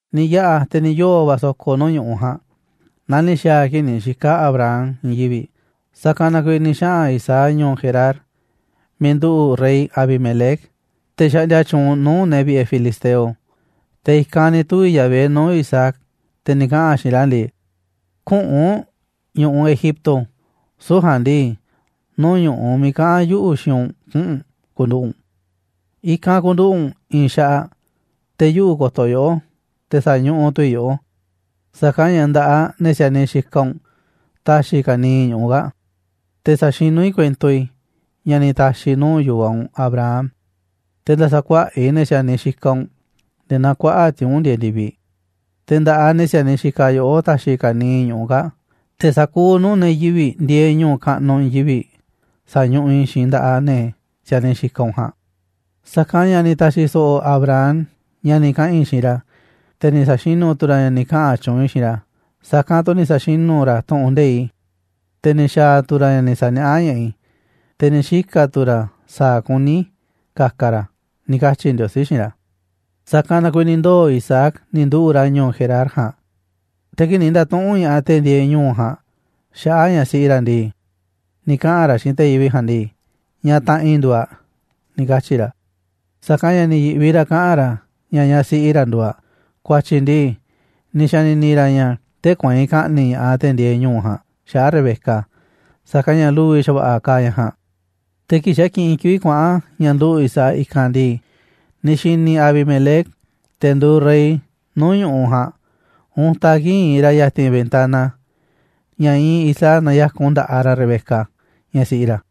Ni̱ yaꞌa̱ te̱ ni̱ yoo̱ va̱ so̱ko̱ nuu̱ꞌ ñu̱ꞌuꞌ ja̱a̱nꞌ, naa ni̱ xa̱a̱ a̱ kii̱ꞌ ni̱ xika̱ Abraham i̱i̱n yivi̱ꞌ. Sa̱kanꞌ na kuiiꞌ ni̱ xaꞌa̱n Isaac ñu̱u̱ Gerar miiꞌ nduꞌu̱ꞌ rey Abimelec, te̱ xaꞌndia tyuunꞌ nuu̱ꞌ ne̱ vi̱ꞌe̱ filisteo. Te̱ i̱kanꞌ ni̱ tuvi̱ Yahvé nuu̱ꞌ Isaac, te̱ ni̱ kaꞌa̱n a̱ xiinꞌ ra̱ ndii: ―Küꞌu̱nꞌ u̱nꞌ ñu̱ꞌuꞌ Egipto, süu̱ꞌ ja̱a̱nꞌ ndii, nuu̱ꞌ ñu̱ꞌuꞌ miiꞌ kaꞌa̱n yuꞌu̱ xiinꞌ u̱nꞌ kuꞌu̱n u̱nꞌ ku̱nduꞌu̱ꞌ u̱nꞌ. I̱kanꞌ ku̱nduꞌu̱ꞌ u̱nꞌ i̱i̱n xaꞌaꞌ, te̱ yuꞌu̱ ko̱to̱ yoꞌó, te̱ sa̱ñuꞌuꞌ tu̱ i̱ yoꞌó, sa̱kanꞌ ña̱ nda̱ꞌaꞌ ne̱ si̱a̱niꞌ xikaꞌ u̱nꞌ ta̱xi̱ i̱ ka̱niiꞌ ñu̱ꞌuꞌ kaa̱ꞌ. Te̱ sa̱xinú i̱ kuento i̱ ña̱ ni̱ ta̱xi̱ i̱ nuu̱ꞌ yu̱vaꞌ u̱nꞌ Abraham. Te̱ nda̱sa̱kuaꞌa̱ꞌ i̱ ne̱ si̱a̱niꞌ xikaꞌ u̱nꞌ nde̱e̱ naa kuaꞌa̱ꞌ tiuu̱nꞌ ndieeꞌ ndi̱viꞌ, te̱ nda̱ꞌaꞌ ne̱ si̱a̱niꞌ xikaꞌ yoꞌó ta̱xi̱ i̱ ka̱niiꞌ ñu̱ꞌuꞌ kaa̱ꞌ, te̱ sa̱kuuꞌ nuu̱ꞌ ne̱ yivi̱ꞌ ndieeꞌ ñu̱u̱ kaꞌnuꞌ i̱i̱n yivi̱ꞌ sa̱ñuꞌuꞌ i̱ xiinꞌ nda̱ꞌaꞌ ne̱ si̱a̱niꞌ xikaꞌ u̱nꞌ ja̱a̱nꞌ. Sa̱kanꞌ ña̱ ni̱ ta̱xi̱ so̱ꞌo̱ Abraham ña̱ ni̱ kaꞌa̱n i̱ xiinꞌ ra̱, te̱ ni̱ sa̱xinu̱ tu̱ ra̱ ña̱ ni̱ kaꞌa̱n tyuunꞌ i̱ xiinꞌ ra̱, sa̱kanꞌ tu̱ ni̱ sa̱xinu̱ ra̱ tu̱ꞌu̱n nde̱iꞌ i̱, te̱ ni̱ xa̱a̱ tu̱ ra̱ ña̱ ni̱ sa̱niaꞌá ña̱ꞌaꞌ i̱, te̱ ni̱ xika̱ tu̱ ra̱ sa̱a̱ kuní i̱ ka̱ka̱ ra̱ ―ni̱ katyi̱ Ndiosí xiinꞌ ra̱. Sa̱kanꞌ na kuiiꞌ ni̱ ndoo̱ Isaac ni̱ nduꞌu̱ꞌ ra̱ ñu̱u̱ Gerar ja̱a̱nꞌ. Te̱ kii̱ꞌ ni̱ nda̱tuꞌu̱nꞌ ña̱ꞌaꞌ te̱ ndieeꞌ ñu̱u̱ ja̱a̱nꞌ xaꞌa̱ꞌ ñaꞌ siꞌi ra̱ ndii, ni̱ kaꞌa̱n ra̱ xiinꞌ te̱ yivi̱ꞌ ja̱a̱nꞌ ndii: ―Ñaꞌ taꞌanꞌ i̱ nduuꞌ aꞌ ―ni̱ katyi̱ ra̱. Sa̱kanꞌ ña̱ ni̱ yi̱ꞌvi ra̱ kaꞌa̱n ra̱ ña̱ ñaꞌ siꞌi ra̱ nduuꞌ aꞌ, ku̱a̱tyi̱ ndii, ni̱ xa̱ni̱ni̱ ra̱ ña̱ tee̱ꞌ kueinꞌ ka̱ꞌni̱ꞌ ña̱ꞌaꞌ te̱ ndieeꞌ ñu̱u̱ ja̱a̱nꞌ xaꞌa̱ꞌ Rebeca, sa̱kanꞌ ña̱ lu̱vi̱ xa̱va̱ꞌa̱ kaaꞌ ñaꞌ ja̱a̱nꞌ. Te̱ kii̱ꞌ xa̱ kiꞌinꞌ kivi̱ꞌ kuaꞌa̱n ña̱ nduꞌu̱ꞌ Isaac i̱kanꞌ ndii, ni̱ xi̱ni̱ Abimelec, te̱ nduuꞌ rey nuu̱ꞌ ñu̱ꞌuꞌ ja̱a̱nꞌ, untaꞌ kii̱ꞌ iinꞌ ra̱ ya̱ti̱n ventana, ña̱ iinꞌ Isaac naya̱kun nda̱ꞌaꞌ ra̱ Rebeca, ñaꞌ siꞌi ra̱.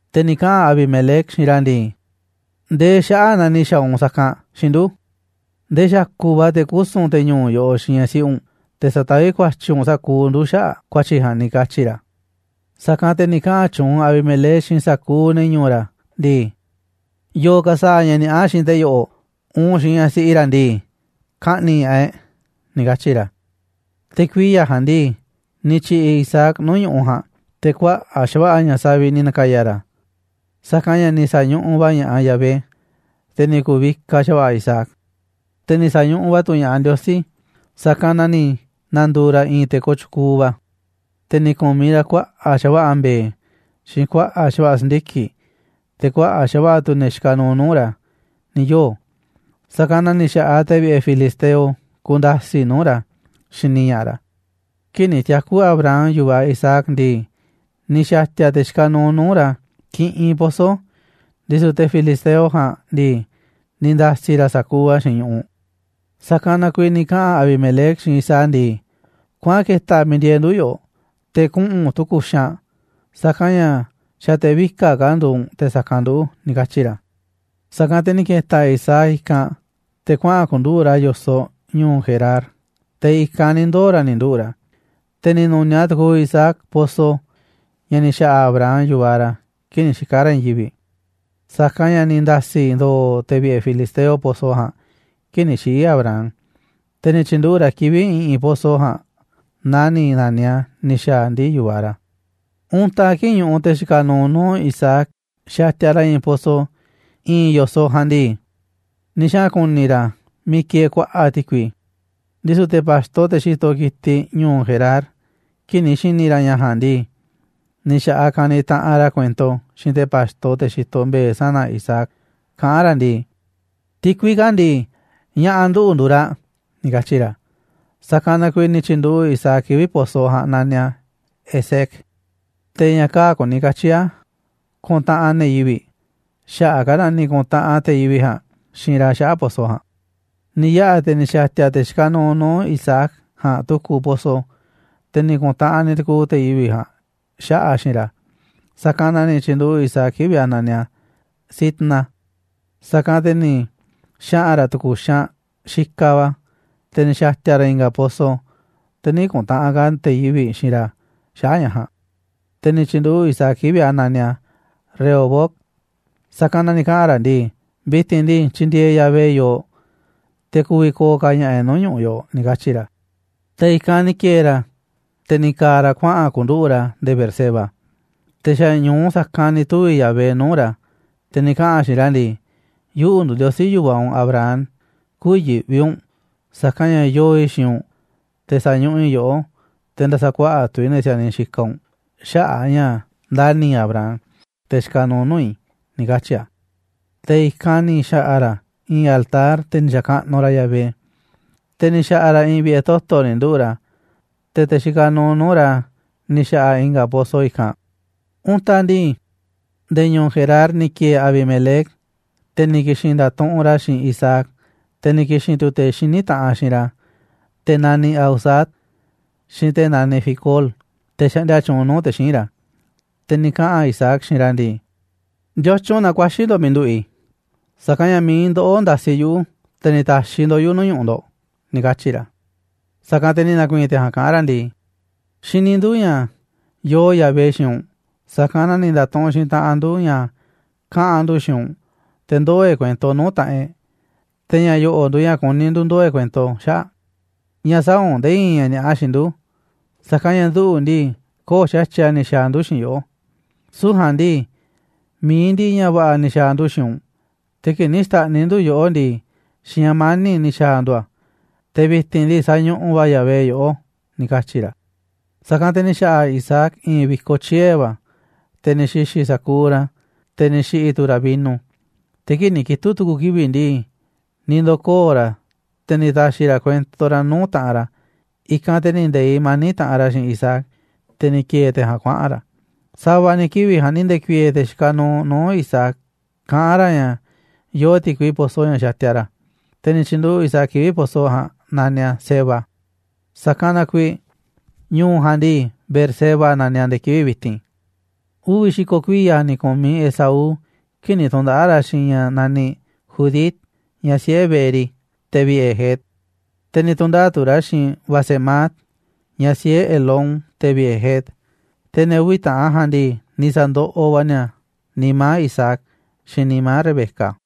Te̱ ni̱ kaꞌa̱n Abimelec xiinꞌ ra̱ ndii: ―¿Ndee xaꞌa̱ꞌ na ni̱ xa̱a̱ u̱nꞌ sa̱kanꞌ xiinꞌ ndu̱? Ndee xa̱ku̱ꞌ va̱ te̱ kusu̱n te̱ ñu̱u̱ yoꞌoꞌ xiinꞌ ñaꞌ siꞌi u̱nꞌ, te̱ sa̱taví ku̱a̱tyi̱ u̱nꞌ sa̱kuuꞌ ndu̱ xaꞌa̱ꞌ ku̱a̱tyi̱ ja̱a̱nꞌ ―ni̱ katyi̱ ra̱. Sa̱kanꞌ te̱ ni̱ kaꞌa̱n tyuunꞌ Abimelec xiinꞌ sa̱kuuꞌ ne̱ ñu̱u̱ ra̱ ndii: ―Yo̱o̱ ka̱ sa̱a̱ ña̱ ni̱a̱ꞌa xiinꞌ te̱ yo̱ꞌo̱, uun xiinꞌ ñaꞌ siꞌi ra̱ ndii, ka̱ꞌni̱ꞌ ña̱ꞌaꞌ e̱ꞌ ―ni̱ katyi̱ ra̱. Te̱ kuiya̱ ja̱a̱nꞌ ndii, ni̱ tyi̱ꞌi̱ Isaac nuu̱ꞌ ñu̱ꞌuꞌ ja̱a̱nꞌ, te̱ kuaꞌa̱ꞌ xa̱va̱ꞌa̱ ña̱ saviꞌ ni̱ na̱ka̱ya̱ ra̱, sa̱kanꞌ ña̱ ni̱ sa̱ñuꞌuꞌ va̱ ña̱ꞌaꞌ Yahvé. Te̱ ni̱ ku̱vikaꞌ xa̱va̱ꞌa̱ Isaac, te̱ ni̱ sa̱ñuꞌuꞌ va̱ tu̱ ña̱ꞌaꞌ Ndiosí, sa̱kanꞌ na ni̱ na̱ndu̱u̱ ra̱ i̱i̱n te̱ kooꞌ tyukuuꞌ va̱. Te̱ ni̱ ku̱miꞌ ra̱ kuaꞌa̱ꞌ xa̱va̱ꞌa̱ mbe̱e̱, xiinꞌ kuaꞌa̱ꞌ xa̱va̱ꞌa̱ si̱ndiki̱ꞌ, te̱ kuaꞌa̱ꞌ xa̱va̱ꞌa̱ tu̱ ne̱ xikaꞌ nuuꞌ nuu̱ꞌ ra̱ ni̱ yoo̱, sa̱kanꞌ na ni̱ xa̱ꞌaꞌ te̱ vi̱ꞌe̱ filisteo kunda̱si̱ꞌ nuu̱ꞌ ra̱ xini ña̱ꞌaꞌ ra̱. Kii̱ꞌ ni̱ tiaku̱ Abraham yu̱vaꞌ Isaac ndii, ni̱ xa̱ti̱a̱ te̱ xikaꞌ nuuꞌ nuu̱ꞌ ra̱ kiꞌinꞌ pozo, ndisu̱ te̱ filisteo ja̱a̱nꞌ ndii, ni̱ nda̱si̱ ra̱ sa̱kuuꞌ a̱ xiinꞌ ñu̱ꞌuꞌ. Sa̱kanꞌ na kuiiꞌ ni̱ kaꞌa̱n Abimelec xiinꞌ Isaac ndii: ―Kuaꞌan ke̱ta̱ miiꞌ ndieeꞌ ndu̱ yoꞌoꞌ, te̱ kuꞌu̱n u̱nꞌ tu̱ku̱ xaanꞌ, sa̱kanꞌ ña̱ xa̱ te̱ vika̱ꞌ ka̱ nduuꞌ u̱nꞌ te̱ sa̱kanꞌ nduꞌu̱ ―ni̱ katyi̱ ra̱. Sa̱kanꞌ te̱ ni̱ ke̱ta̱ Isaac i̱kanꞌ te̱ kuaꞌa̱n ku̱nduꞌu̱ꞌ ra̱ yo̱soꞌ ñu̱u̱ Gerar, te̱ i̱kanꞌ ni̱ ndoo̱ ra̱ ni̱ nduꞌu̱ꞌ ra̱. Te̱ ni̱ nu̱niaꞌ tu̱ku̱u̱ Isaac pozo ña̱ ni̱ xa̱ꞌa̱ Abraham yu̱vaꞌ ra̱ kii̱ꞌ ni̱ xika̱ ra̱ i̱i̱n yivi̱ꞌ, sa̱kanꞌ ña̱ ni̱ nda̱si̱ ndo̱o̱ te̱ vi̱ꞌe̱ filisteo pozo ja̱a̱nꞌ kii̱ꞌ ni̱ xiꞌi̱ Abraham, te̱ ni̱ tyi̱nduꞌu̱ꞌ ra̱ kivi̱ꞌ i̱ꞌi̱n pozo ja̱a̱nꞌ naa ni̱ na̱niꞌ a̱ ni̱ xa̱a̱ ndii̱ yu̱vaꞌ ra̱. Untaꞌ kii̱ꞌ ñuꞌuꞌ te̱ xikaꞌ nuuꞌ nuu̱ꞌ Isaac xatiaꞌ ra̱ i̱i̱n pozo i̱i̱n yo̱soꞌ ja̱a̱nꞌ ndii, ni̱ xaꞌa̱n ku̱ni̱ ra̱ miiꞌ kieeꞌ kuaꞌa̱ꞌ ti̱kui. Ndisu̱ te̱ pa̱xto, te̱ xitoꞌ ki̱tiꞌ ñu̱u̱ Gerar, kii̱ꞌ ni̱ xi̱ni̱ ra̱ ña̱ ja̱a̱nꞌ ndii, ni̱ xa̱ꞌaꞌ kaniꞌ taꞌanꞌ ra̱ kuento xiinꞌ te̱ pa̱xto, te̱ xitoꞌ mbe̱e̱ sana̱ Isaac, kaꞌán ra̱ ndii: ―Ti̱kui kaa̱ꞌ ndii, ña̱ꞌa̱ nduꞌu̱ nduuꞌ raꞌ ―ni̱ katyi̱ ra̱. Sa̱kanꞌ na kuiiꞌ ni̱ tyi̱nduꞌu̱ꞌ Isaac kivi̱ꞌ pozo ja̱a̱nꞌ naniꞌ a̱ Esek, te̱ ña̱ kaa̱ꞌ kuni katyi̱ a̱ kuntaꞌanꞌ ne̱ yivi̱ꞌ, xaꞌa̱ꞌ a̱ ka̱ ni̱ ku̱ntaꞌanꞌ te̱ yivi̱ꞌ ja̱a̱nꞌ xiinꞌ ra̱ xaꞌa̱ꞌ pozo ja̱a̱nꞌ. Ni̱ yaꞌa̱ te̱ ni̱ xa̱ti̱a̱ te̱ xikaꞌ nuuꞌ nuuꞌ Isaac ja̱a̱nꞌ tu̱ku̱ pozo, te̱ ni̱ ku̱ntaꞌanꞌ ni̱ tu̱ku̱u̱ te̱ yivi̱ꞌ ja̱a̱nꞌ xaꞌa̱ꞌ a̱ xiinꞌ ra̱, sa̱kanꞌ na ni̱ tyi̱nduꞌu̱ꞌ Isaac kivi̱ꞌ a̱ naniꞌ a̱, Sitna. Sa̱kanꞌ te̱ ni̱ xaꞌa̱n ra̱ tu̱ku̱ xaanꞌ xikaꞌ va̱, te̱ ni̱ xa̱ti̱a̱ ra̱ i̱nga̱ pozo, te̱ nï̱ ku̱ntaꞌanꞌ ka̱ te̱ yivi̱ꞌ xiinꞌ ra̱ xaꞌa̱ꞌ ña̱ ja̱a̱nꞌ, te̱ ni̱ tyi̱nduꞌu̱ꞌ Isaac kivi̱ꞌ a̱ naniꞌ a̱ Rehobot, sa̱kanꞌ na ni̱ kaꞌa̱n ra̱ ndii: «Vi̱ti̱n ndii, tyindieeꞌ Yahvé yooꞌ, te̱ ku̱vi̱ ko̱o̱ ka̱ ña̱ꞌa̱ e̱ꞌ nuu̱ꞌ ñu̱ꞌuꞌ yoꞌoꞌ», ni̱ katyi̱ ra̱. Te̱ i̱kanꞌ ni̱ ki̱e̱e̱ ra̱, te̱ ni̱ ka̱a̱ ra̱ kuaꞌa̱n ku̱nduꞌu̱ꞌ ra̱ nde̱e̱ Beerseba. Te̱ xa̱ ñu̱u sa̱kanꞌ ni̱ tuvi̱ Yahvé nuu̱ꞌ ra̱, te̱ ni̱ kaꞌa̱n a̱ xiinꞌ ra̱ ndii: ―Yuꞌu̱ nduuꞌ Ndiosí yu̱vaꞌ u̱nꞌ Abraham, kü̱yi̱ꞌvi u̱nꞌ, sa̱kanꞌ ña̱ yoo i̱ xiinꞌ u̱nꞌ, te̱ sa̱ñuꞌuꞌ i̱ yoꞌó, te̱ nda̱sa̱kuaꞌa̱ꞌ tu̱ i̱ ne̱ si̱a̱niꞌ xikaꞌ u̱nꞌ xaꞌa̱ꞌ a̱ ña̱ ndani̱ i̱ Abraham, te̱ xikaꞌ nuuꞌ nuu̱ꞌ i̱ ―ni̱ katyi̱ a̱. Te̱ i̱kanꞌ ni̱ xa̱ꞌa̱ ra̱ i̱i̱n altar, te̱ ni̱ xa̱kaꞌnuꞌ ra̱ Yahvé. Te̱ ni̱ xa̱ꞌa̱ ra̱ i̱i̱n vi̱ꞌe̱ toto̱ ni̱ nduꞌu̱ꞌ ra̱, te̱ te̱ xikaꞌ nuuꞌ nuu̱ꞌ ra̱ ni̱ xa̱ꞌa̱ i̱nga̱ pozo i̱kanꞌ. Untaꞌ ndii, nde̱e̱ ñu̱u̱ Gerar ni̱ ki̱e̱e̱ Abimelec, te̱ ni̱ ki̱xi̱n nda̱tuꞌunꞌ ra̱ xiinꞌ Isaac, te̱ ni̱ ki̱xi̱n tu̱ te̱ xiní taꞌanꞌ xiinꞌ ra̱, te̱ naniꞌ Ahuzat, xiinꞌ te̱ naniꞌ Ficol, te̱ xaꞌndia tyuunꞌ nuu̱ꞌ te̱ xíinꞌ ra̱. Te̱ ni̱ kaꞌa̱n Isaac xiinꞌ ra̱ ndii: ―¿Ndiotyun na ku̱a̱xi̱ ndo̱ꞌ miiꞌ nduꞌu̱ꞌ i̱? Sa̱kanꞌ ña̱ mi̱iꞌ ndoꞌó ndasiꞌ yuꞌu̱, te̱ ni̱ ta̱xiꞌ ndo̱ꞌ yuꞌu̱ nuu̱ꞌ ñu̱ꞌuꞌ ndo̱ꞌ ―ni̱ katyi̱ ra̱. Sa̱kanꞌ te̱ ni̱ na̱ku̱i̱i̱n te̱ ja̱a̱nꞌ kaꞌán ra̱ ndii: ―Xini ndu̱ ña̱ yoo Yahvé xiinꞌ u̱nꞌ, sa̱kanꞌ na ni̱ nda̱tuꞌunꞌ xiinꞌ taꞌanꞌ ndu̱ ña̱ kaꞌa̱n ndu̱ xiinꞌ u̱nꞌ, te̱ ndoo̱ e̱ꞌ kuento nuu̱ꞌ taꞌanꞌ e̱ꞌ, te̱ ña̱ yo̱ꞌo̱ nduuꞌ ña̱ kuní ndu̱ ndoo̱ e̱ꞌ kuento xaꞌa̱ꞌ. Ña̱ sä̱a̱ u̱nꞌ nde̱e̱ i̱i̱n ña̱ ni̱a̱ꞌa xiinꞌ ndu̱, sa̱kanꞌ ña̱ nduꞌu̱ ndii, köo̱ꞌ xa̱tyiꞌ a̱ ni̱ xa̱a̱ ndu̱ xiinꞌ yoꞌó, süu̱ꞌ ja̱a̱nꞌ ndii, mi̱iꞌ ndiꞌiꞌ ña̱ va̱ꞌa̱ ni̱ xa̱a̱ ndu̱ xiinꞌ u̱nꞌ, te̱ kii̱ꞌ ni̱ xta̱ꞌniꞌ ndu̱ yoꞌó ndii, xiinꞌ ña̱ mani̱ꞌ ni̱ xa̱a̱ ndu̱ a̱, te̱ vi̱ti̱n ndii, sañuꞌuꞌ va̱ Yahvé yoꞌó ―ni̱ katyi̱ ra̱. Sa̱kanꞌ te̱ ni̱ xa̱ꞌa̱ Isaac i̱i̱n vi̱koꞌ tyie̱ va̱, te̱ ni̱ xi̱xi̱ sa̱kuuꞌ ra̱, te̱ ni̱ xi̱ꞌi̱ tu̱ ra̱ vino. Te̱ kii̱ꞌ ni̱ kitu̱ꞌ tu̱ku̱ kivi̱ꞌ ndii, ni̱ ndo̱koo̱ ra̱, te̱ ni̱ ta̱xi̱ ra̱ kuento ra̱ nuu̱ꞌ taꞌanꞌ ra̱. I̱kanꞌ te̱ ni̱ nde̱iꞌ mani̱ꞌ taꞌanꞌ ra̱ xiinꞌ Isaac, te̱ ni̱ ki̱e̱e̱ te̱ ja̱a̱nꞌ kuaꞌa̱n ra̱. Sa̱va̱ ni̱ kivi̱ꞌ ja̱a̱nꞌ ni̱ nde̱ku̱i̱e̱e̱ te̱ xikaꞌ nuuꞌ nuu̱ꞌ Isaac, kaꞌán ra̱ ña̱ yoo ti̱kui pozo ña̱ xatiaꞌ ra̱. Te̱ ni̱ tyi̱nduꞌu̱ꞌ Isaac kivi̱ꞌ pozo ja̱a̱nꞌ naniꞌ a̱ Seba, sa̱kanꞌ na kuiiꞌ ñu̱u̱ ja̱a̱nꞌ ndii, Beerseba naniꞌ a̱ nde̱e̱ kivi̱ꞌ vi̱ti̱n. Uvi̱ xi̱ko̱ kuiya̱ ni̱ ku̱miꞌ Esaú kii̱ꞌ ni̱ tu̱ndaꞌa̱ꞌ ra̱ xiinꞌ i̱i̱n ñaꞌ naniꞌ Judit, ñaꞌ siꞌe̱ Beeri, te̱ vi̱ꞌe̱ Het. Te̱ ni̱ tu̱ndaꞌa̱ꞌ tu̱ ra̱ xiinꞌ Basemat, ñaꞌ siꞌe̱ Elón, te̱ vi̱ꞌe̱ Het. Te̱ ne̱ uvi̱ taꞌan ja̱a̱nꞌ ndii, ni̱ sa̱ndoꞌoꞌ va̱ ni̱a̱ nimá Isaac, xiinꞌ nimá Rebeca.